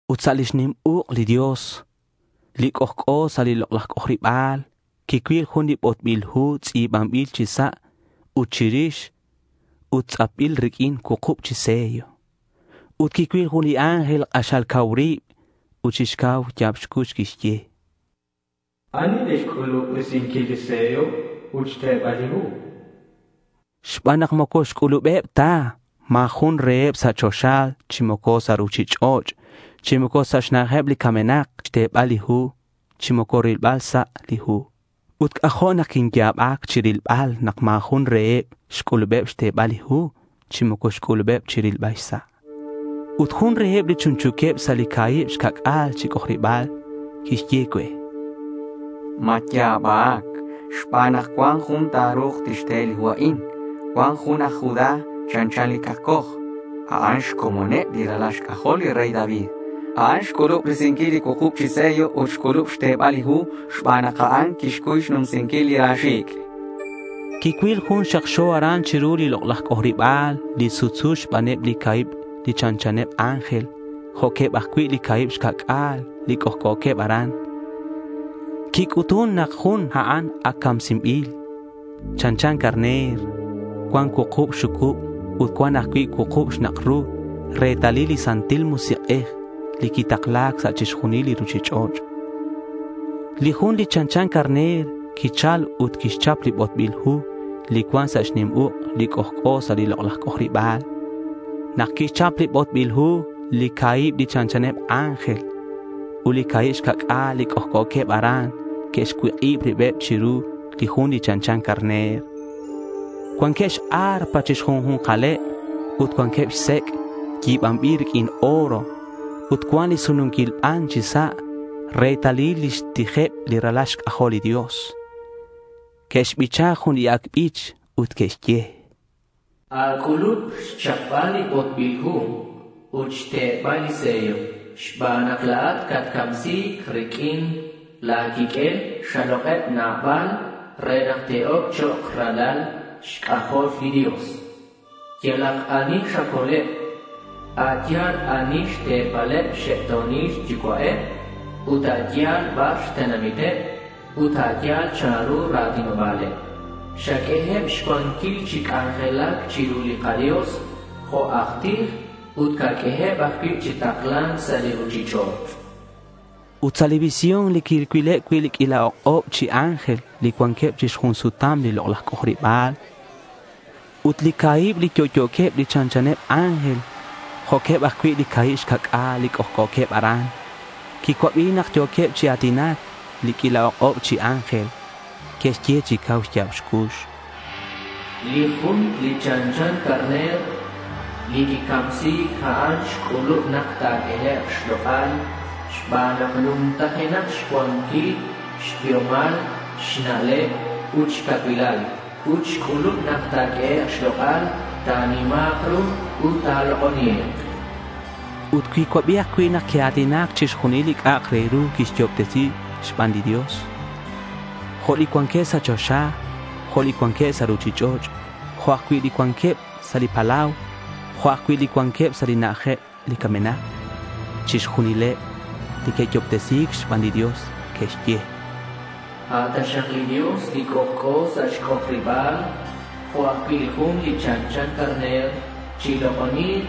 Ut sa' lix nim uk' li Dios li c'ojc'o sa' li lok'laj c'ojariba̱l quicuil jun li botbil hu tz'i̱banbil chi sa' ut chirix ut tz'apbil riq'uin cuukub li sello. Ut quicuil jun li ángel k'axal cau rib ut chi cau xya̱b xcux quixye: —¿Ani li xc'ulub risinquil li sello ut xtebal li hu? chan. Xban nak moco xc'ulubeb ta, ma̱ jun reheb sa' choxa, chi moco sa' ruchich'och', chi moco sa' xna'ajeb li camenak quiru xtebal li hu chi moco rilbal xsa' li hu. Ut c'ajo' nak quinya̱bac chirilbal nak ma̱ jun reheb xc'ulubeb xtebal li hu chi moco xc'ulubeb rilbal xsa'. Ut jun reheb li chunchu̱queb sa' li ca̱hib xca'c'a̱l chi c'ojariba̱l quixye cue: —Matya̱bac xban nak cuan jun ta̱ru̱k tixte li hu a'in. Cuan jun aj Judá chanchan li cakcoj. A'an xcomoneb li ralal xc'ajol li rey David. A'an xc'ulub risinquil li cuukub chi sello ut xc'ulub xtebal li hu xban nak a'an quixcuy xnumsinquil li ra xi̱c', chan. Quicuil Jun xakxo aran chiru li lok'laj c'ojariba̱l li sutsu xbaneb li ca̱hib li chanchaneb ángel jo'queb ajcui' li ca̱hib xca'c'a̱l li c'ojc'o̱queb aran. Quic'utun nak li jun a'an ac camsinbil. Chanchan carner. Cuan cuukub xxucub ut cuan ajcui' cuukub xnak' ru retalil li Santil Musik'ej li quitakla̱c sa' chixjunil li ruchich'och'. Li Jun li chanchan carner quichal ut quixchap li botbil hu li cuan sa' xnim uk' li c'ojc'o sa' li lok'laj c'ojariba̱l. Nak quixchap li botbil hu, li ca̱hib li chanchaneb ángel ut li ca̱hib xca'c'a̱l li c'ojc'o̱queb aran que'xcuik'ib ribeb chiru li Jun li chanchan carner. Cuanqueb x-arpa chi xju̱nkaleb ut cuanqueb xsec' yi̱banbil riq'uin oro ut cuan li sununquil ban chi sa' retalil lix tijeb li ralal xc'ajol li Dios. Que'xbicha jun li ac' bich ut que'xye: —A̱c'ulub xchapbal li botbil hu ut xtebal li sello xban nak la̱at catcamsi̱c. Riq'uin la̱ quiq'uel xalok'eb nabal re nak te'oc chok' ralal xc'ajol li Dios. Yalak ani xacoleb a' yal ani xte̱paleb xxe'to̱nil yucua'eb, ut a' yal bar xtenamiteb ut a' yal chanru li ra̱tinoba̱leb. Xaq'ueheb xcuanquil chi c'anjelac chiru li kaDios jo' aj tij, ut ta̱q'ueheb ajcui' chi takla̱nc sa' ruchich'och'.— Ut sa' li visión quicuileb li q'uila ok'ob chi ángel li cuanqueb chi xjun sutam li lok'laj c'ojariba̱l ut li ca̱hib li yo'yo̱queb li chanchaneb ángel jo'queb ajcui' li ca̱hib xca'c'a̱l li c'ojc'o̱queb aran. Quicuabi nak yo̱queb chi a̱tinac li q'uila ok'ob chi ángel. Que'xye chi cau xya̱b xcux: —Li Jun li chanchan carner li quicamsi̱c, a'an xc'ulub nak ta̱q'uehek' xlok'al xban nak numtajenak xcuanquil, xbiomal, xna'leb, ut xcacuilal. Ut xc'ulub nak ta̱q'uehek' xlok'al, ta̱nima̱k ru ut ta̱lok'oni̱k.— Ut quicuabi ajcui' nak que'a̱tinac chixjunil li c'a'ak re ru quiyo'obtesi̱c xban li Dios, jo' li cuanqueb sa' choxa, jo' li cuanqueb sa' ruchich'och', jo' ajcui' li cuanqueb sa' li palau, jo'queb ajcui' li cuanqueb sa' xna'ajeb li camenak. Chixjunileb li que'yo'obtesi̱c xban li Dios que'xye: —A' taxak li Dios li c'ojc'o sa' xc'ojariba̱l jo' ajcui' li Jun li chanchan carner, chilok'oni̱k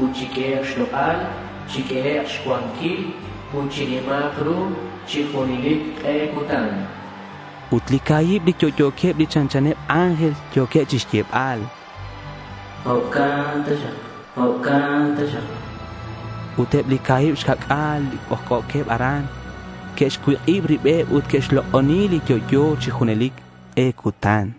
ut chiq'uehek' xlok'al. Chiq'uehek' xcuanquil ut chinima̱k ru chi junelic k'e cutan.— Ut li ca̱hib li yo'yo̱queb li chanchaneb ángel, yo̱queb chixyebal: —Jo'can taxak.— Ut eb li ca̱hib xca'c'a̱l li c'ojc'o̱queb aran que'xcuik'ib ribeb ut que'xlok'oni li yo'yo chi junelic k'e cutan.